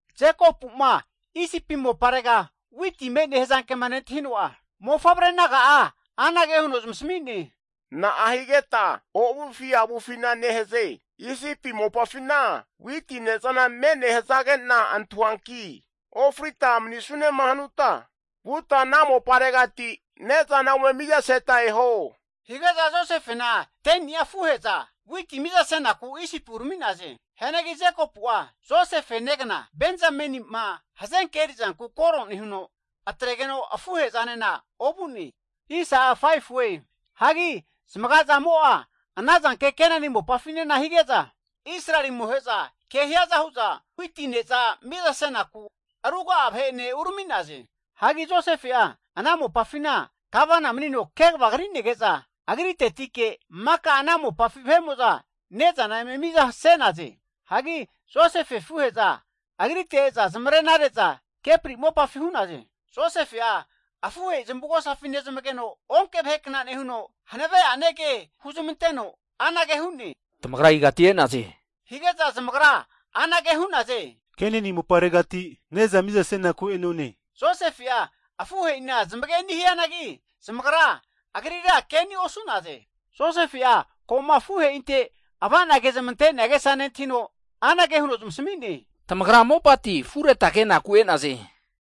Jekopu'ma Isipi moparega witi me'ne hazankema nentahino'a, ne'mofavre naga'a anage huno zamasmi'ne, Na'a higeta ovufi avufina nehaze? Isipi mopafina witi ne'zana me'ne hazage'na antahuanki, ofrita manisunema hanuta vuta ana moparegati ne'zana ome mizaseta eho. Hige'za Josefena 10ni'a afuhe'za witi miza senaku Isipi urami'naze. Hianagi Jekopu'a Josefe negna Benzameni'ma hazenke erizanku koro nehuno, atregeno afuhe'zanena ovu'ne. Hagi zamaga'zamo' a ana zanke Kenani mopafinena hige'za Israeli amohe'za ke hiaza hu'za witi ne'za miza senaku ruga'a vahe'ene urami'naze. Hagi Josefe'a ana mopafina gavana manino kegava kri'nege'za agritetike maka ana mopafi vahe'mo'za ne'zana eme miza se'naze. Hagi Josefe afuhe'za agrite e'za zamarena re'za kepri mopafi hu'naze. Josefe'a afuhe'i zamavugosafi nezmageno, onke vahekna nehuno hanave'ane ke huzmanteno anage hu'ne, tamagra igati e'naze? Hige'za zamagra anage hu'naze, Kenani moparegati ne'za miza senaku e'none. Josefe'a afuhe'ina zamageni' hianagi, zamagra agrira keni' osu'naze. Josefe'a ko'ma afuhe'inte ava'na kezamte'nea agesa nentahino anage huno zamasmi'ne, Tamagra mopati afureta kenaku e'naze.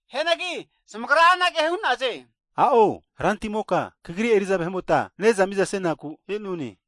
Hianagi zamagra anage hu'naze, a'o, rantimoka kagri eri'za vahe'mota ne'za miza senaku e'none.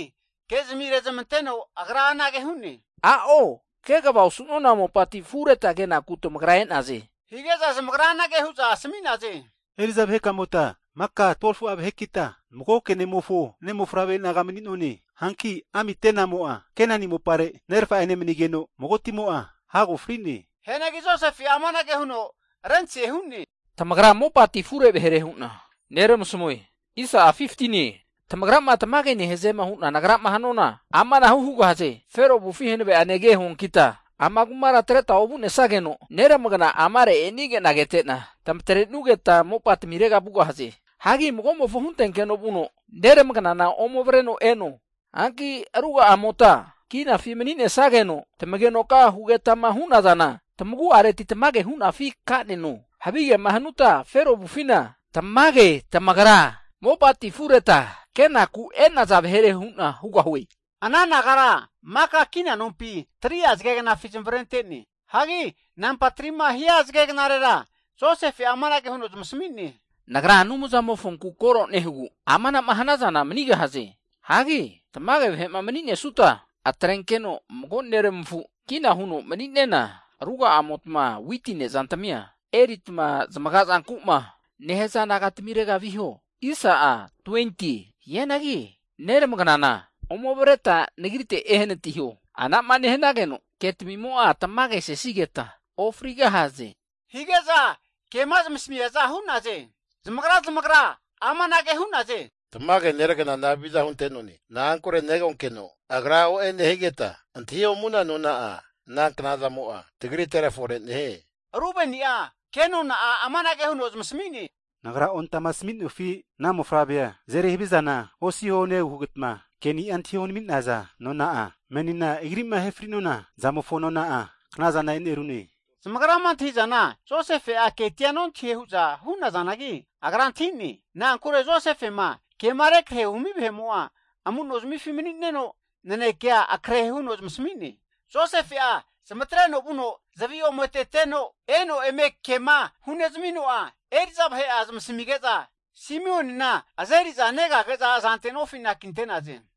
Anage hazanagi ke'zmi rezmanteno agra anage hu'ne, A'o, kegava osu'nona mopati afureta kenaku tamagra e'naze! Hige'za zamagra anage hu'za asami'naze, Eri'za vahe'kamota maka 12fu'a vahekita magoke ne'mofo ne'mofavre naga mani'none. Hanki amitenamo'a Kenani mopare nerfa'ene manigeno, magotimo'a hago fri'ne. Hianagi Josefe'a amanage huno rentase hu'ne, Tamagra mopati afure vahere hu'na neramasamue. Tamagrama tamage nehaze hunama nagrama hanuana, amanahu hugahaze. Fero avufi hanave'ane ke huankita, ama kumara atreta ovu'nesageno, neramagna amare' e'nige'na kete'na, tamatrenugeta mopatamirega vugahaze. Hagi mago'mofo huntenkeno vuno neramagnana ome avreno eno. Hanki ruga'amota kinafi mani'nesageno, tamagenoka hugetama hunazana, tamagu'areti tamage hunafi kaneno. Havigema hanuta Fero avufina, tamage tamagra mopati afureta kenaku enaza vahere hu'na hugahue. Ana nagara maka kina nompi 3'a zagegnafi zamavarentene. Hagi namba 3ma hia zagegnarera Josefe'a amanage huno zamasmi'ne, Nagra Anumzamofonku koro nehugu amana'ma hanazana manigahaze. Hagi tamage vahe'ma mani'nesuta, atrenkeno mago neramafu kina huno mani'nena, ruga'amotma witi ne'zantmia erita zamaga zanku'ma nehaza naga tamirega viho. Hianagi neramagnana ome avreta nagrite ehanatiho. Anama nehanageno ketamimo'a tamagesesigeta ofrigahaze. Hige'za kema zamasmiaza hu'naze. Zamagra zamagra amanage hu'naze, tamage neragnana haviza hunte'none. Na'ankure negonkeno agra o'e nehigeta antahiomuna nona'a ana knazamo'a tagritera fore nehie. Rubeni'a ke nona'a amanage huno zamasami'ne, Nagra ontamasami'nofi, ana mofavrea azeri havizana osiho nehugeta ke'nia antahi onami'naza nona'a, menina agri'ma ahe fri'nona zamofo nona'a knazana enerune. Zamagrama antahi'zana Josefe'a ketia nontahie hu'za hu'nazanagi, agra antahine. Na'ankure Josefema kema rekrahe humi vahe'mo'a amu'nozamifi mani'neno, nanekea akrehe huno zamasmi'ne. Josefe'a zamatreno vuno zavi ome atete'no, eno eme kema hunezmino'a, eri'za vahe'a zamasmige'za, Simeonina azeri'za negage'za azante nofi anakinte'naze.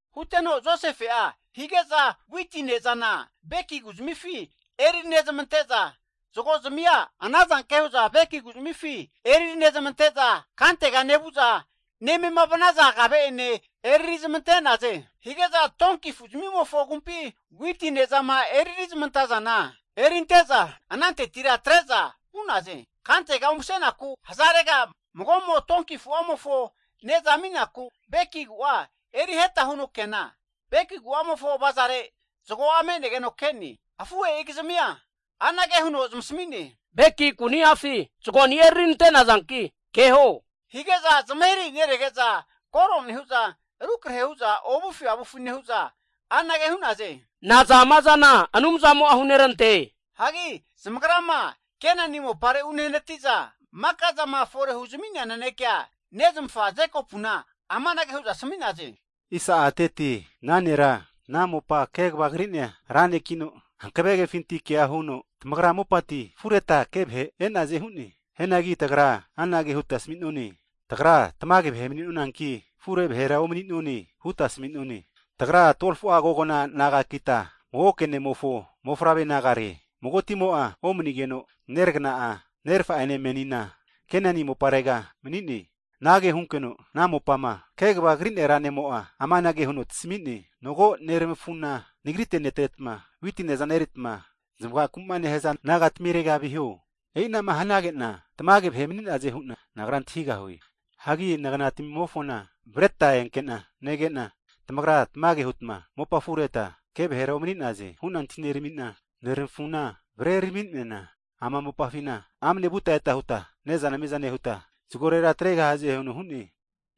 Huteno Josefe'a hige'za witi ne'zana beki ku'zmifi eriri nezmante'za, zagozmia ana zanke hu'za beki kuzmifi eriri nezamante'za, kantega nevu'za nemema vanaza kave'ene eriri zamante'naze. Hige'za donki afu'zmimofo agumpi witi ne'zama eririzmantaza erinte'za anantetira atre'za vu'naze. Kantega umsenaku hazarega mago'mo donki afu'amofo ne'zama aminaku beki ku'a eriheta huno keana, beki ku'amofo avazare zago'a me'negeno ke'ne. Afuhe'igizmia anage huno zamasami'ne, Beki ku'niafi zagonia eriri nante'nazanki keho. Hige'za zamahirahi nerege'za koro nehu'za rukre hu'za ovufi avufi nehu'za, anage hu'naze, Naza ama zana Anumzamo'a hunerante? Hagi zamagrama Kenani mopare unehanati'za, maka'zama fore huzmi'nea nanekea nezmafa Jekopuna amanage hu'za asmi'naze. Ana nera, ana mopa kegava kri'nea ra nekino, hanave kefintike kea huno, tamagra mopati afureta ke vahe e'naze hu'ne. Hianagi tagra anage huta asami'none, Tagra tamage vahe mani'nonanki, afure vahera omani'none huta asami'none. Tagra 12fu'a kogna nagakita, magoke ne'mofo mofavre nagare. Magotimo'a omanigeno, neragana'a nerafa'ene menina Kenani moparega mani'ne. Anage hunkeno ana mopama kegava kri'nea ra ne'mo'a amanage huno tasami'ne, Mago nermafuna nagrite netretma, witi ne'za eneritma zamagaku'ma nehaza nagatamirega viho. E'inama hanage'na, tamage vahe mani'naze hu'na nagra antahigahue. Hagi nagnatamimofona avreta enkena negena, tamagra tamage huta mopa afureta ke vahera omani'naze hu'na antahi neramina, neramafuna avreraminena ama mopafina amne vute'ete huta ne'zana miza nehuta zagorera atregahaze huno hu'ne.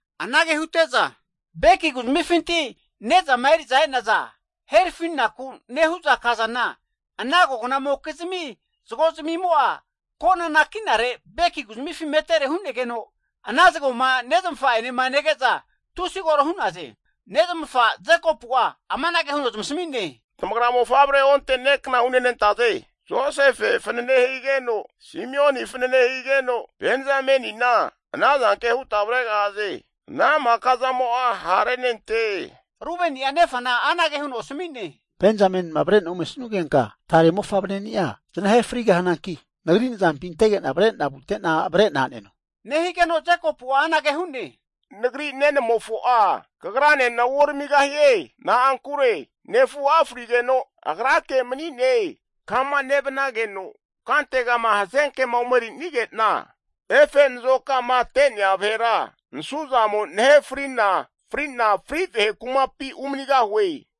Anage hute'za beki ku'zmifinti ne'zama eri'za e'naza herafinaku nehu'za kazana ana kognamokizmi zago'zmia kona anakinare beki ku'zmifi metere hu'negeno, ana zagoma nezmafa'enema nege'za tusi koro hu'naze. Nezmafa Jekopu'a amanage huno zamasmi'ne, Tamagra mofavre onte ne' kna hunenantaze. Josefe fanane higeno, Simeon fanane higeno, Benzamenina ana zanke huta avregahaze, ana maka zamo'a ha' renante. Rubeni'a nefana anage huno asami'ne, Benzamenima avre'na omesugenka tare ne'mofavreni'a zanahe frigahananki, nagri nazampi antege'na avre'na vute'na avre'na aneno. Nehigeno Jekopu'a anage hu'ne, Nagri nenamofo'a kagranena uoramigahie. Nankure nefu'a frigeno, agrake mani'ne. Kama nevnageno kantegama hazenkema omeri'nige'na, efe nazokamate'nea vahera nasuzamo nahefri'na fri'na fri vahe kumapi (Seol) umanigahue.